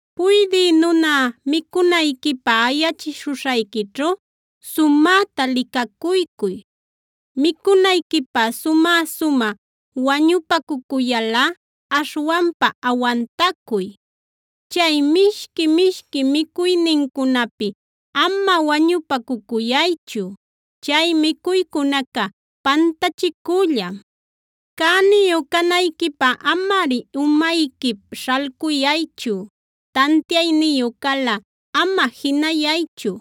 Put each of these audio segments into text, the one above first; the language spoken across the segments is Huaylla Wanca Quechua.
Puydï nuna micunayquipä ayachishuśhayquićhu sumäta licacuycuy. Micunayquipä sumä-sumä wañupacucuyalꞌa aśhwanpa awantacuy. Chay mishqui-mishqui micuynincunapi ama wañupacucuyaychu; chay micuycunaca pantachicüllam. Cäniyu canayquipä amari umayquip śhalcuyaychu. Tantiayniyu calꞌa ama jinayaychu;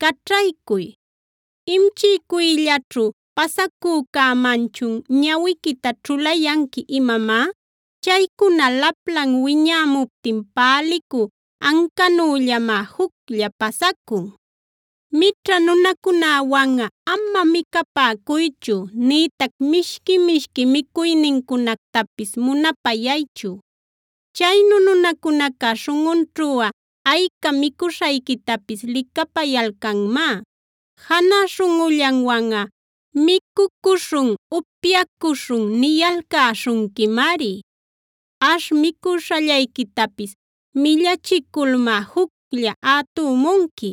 caćhaycuy. ¿Imchiycuyllaćhu pasacücämanchun ñawiquita ćhulayanqui imamá? Chaycuna laplan wiñämuptin pälicü ancanüllamá juclla pasacun. Mićha nunacunäwanꞌa ama micapäcuychu, nïtac mishqui-mishqui micuynincunactapis munapayaychu. Chaynu nunacunaca śhunꞌunćhuꞌa ayca micuśhayquitapis licapayalcanmá. Janä śhunꞌullanwanꞌa: “Micucuśhun, upyacuśhun” niyalcäśhunquimari. Ash micuśhallayquitapis millachiculmá juclla ätumunqui;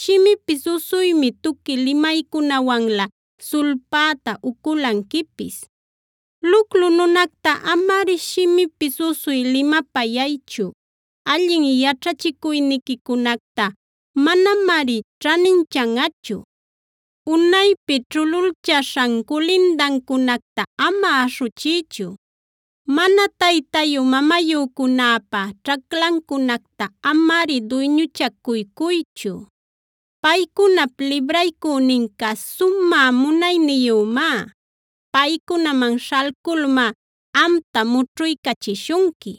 shimipis usuymi tuqui limaycunawanlä sulpäta uculanquipis. Luclu nunacta amari shimipis usuy limapayaychu; allin yaćhachicuyniquicunacta manamari ćhaninchanꞌachu. Unaypi ćhululchaśhan culindancunacta ama aśhuchiychu; mana taytayu-mamayücunäpa ćhaclancunacta amari duyñuchacuycuychu. Paycunap Libraycüninca sumä munayniyümá; paycunaman śhalculmá amta mućhuycachishunqui.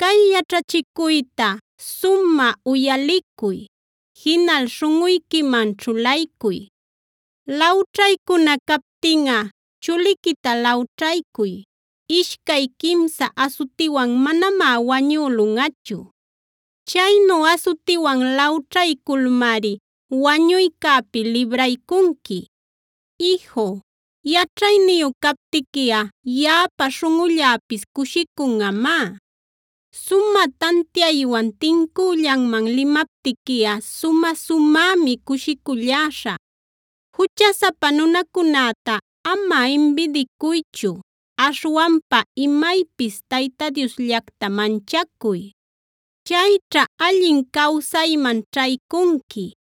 Cay yaćhachicuyta sumä uyalicuy, jinal śhunꞌuyquiman ćhulaycuy. Lawćhaycuna captinꞌa chuliquita lawćhaycuy; ishcay quimsa asutiwan manamá wañülunꞌachu. Chaynu asutiwan lawćhayculmari wañuycäpi libraycunqui. Iju, yaćhayniyu captiquiꞌa yaꞌapa śhunꞌulläpis cushicunꞌamá. Sumä tantiaywan tincüllanman limaptiquiꞌa sumä-sumämi cushiculläśhä. Juchasapa nunacunäta ama imbidiacuychu;a aśhwanpa imaypis Tayta Diosllacta manchacuy. Chayćha allin cawsayman ćhaycunqui;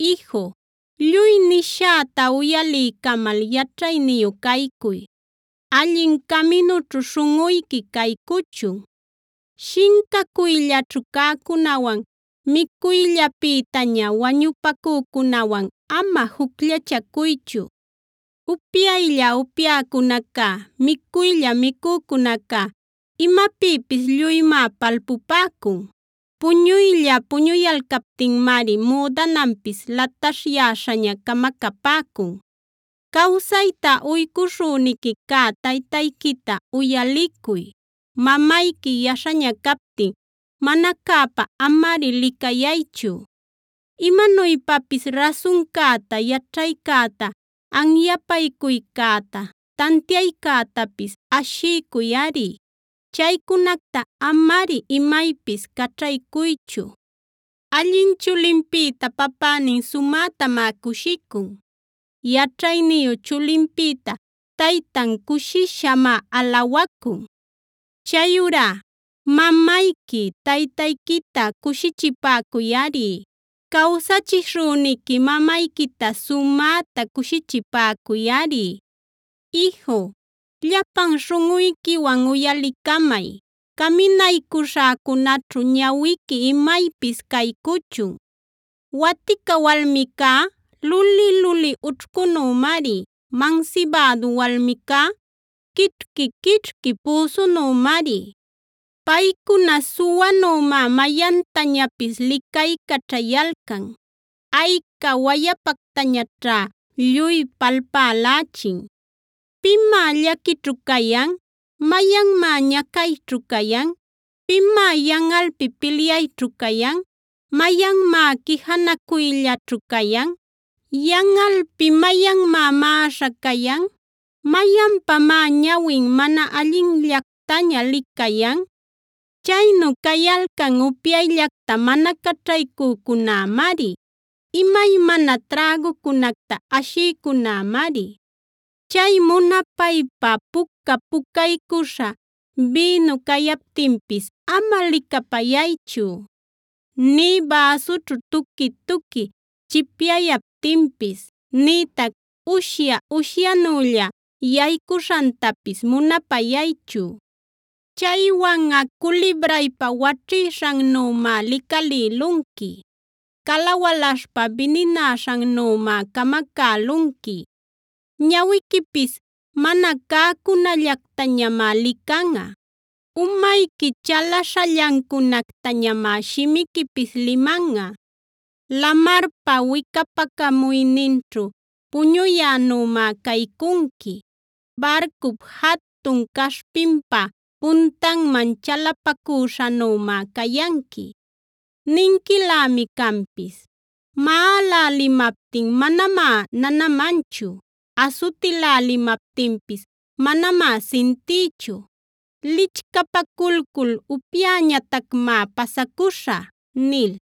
Iju, lluy nishäta uyaliycamal yaćhayniyu caycuy; allin caminućhu śhunꞌuyqui caycuchun. Shincacuyllaćhu cäcunäwan, micuyllapïtaña wañupacücunäwan ama jucllachacuychu. Upyaylla upyäcunacá, micuylla micücunacá imapïpis lluymá palpupäcun. Puñuylla puñuyalcaptinmari müdananpis lataśhyäśhaña camacapäcun. Cawsayta uycuśhüniqui cä taytayquita uyalicuy; mamayqui yaśhaña captin mana cäpa amari licayaychu. Imanuypapis rasuncäta, yaćhaycäta, anyapaycuycäta, tantiaycätapis ashiycuyꞌari. Chaycunacta amari imaypis caćhaycuychu. Allin chulinpïta papänin sumätamá cushicun; yaćhayniyu chulinpïta taytan cushishamá alawacun. Chayurá ¡mamayqui, taytayquita cushichipäcuyꞌari! ¡Cawsachishüniqui mamayquita sumäta cushichipäcuyꞌari! Iju, llapan śhunꞌuyquiwan uyalicamay; caminaycuśhäcunaćhu ñawiqui imaypis caycuchun. Watica walmicá luli-luli ućhcunümari; mansibädu walmicá quićhqui-quićhqui püsunümari. Paycuna suwanümá mayantañapis licaycaćhayalcan; ayca wayapactañaćhá lluy palpälächin. ¿Pimá llaquićhu cayan? ¿Mayanmá ñacayćhu cayan? ¿Pimá yanꞌalpi pilyayćhu cayan? ¿Mayanmá quijanacuyllaćhu cayan? ¿Yanꞌalpi mayanmá maꞌaśha cayan? ¿Mayanpamá ñawin mana allinllactaña licayan? Chaynu cayalcan upyayllacta mana caćhaycücunämari; imaymana trägucunacta ashïcunämari. Chay munapaypa puca-pucaycuśha bïnu cayaptinpis ama licapayaychu, nï bäsućhu tuqui-tuqui chipyayaptinpis, nïtac ushya-ushyanülla yaycuśhantapis munapayaychu. Chaywanꞌa culibraypa waćhïshannümá licalïlunqui; cala walaśhpa bininäśhannümá camacälunqui. Ñawiquipis mana cäcunallactañamá licanꞌa; umayqui chalaśhallancunactañamá shimiquipis limanꞌa. Lamarpa wicapacamuyninćhu puñuyänümá caycunqui; barcup jatun caśhpinpa puntanman chalapacüśhanümá cayanqui. Ninquilämi canpis: “Maꞌalälimaptin manamá nanamanchu, asutilälimaptinpis manamá sintïchu, lichcapaculcul upyäñatacmá pasacuśhä” nil.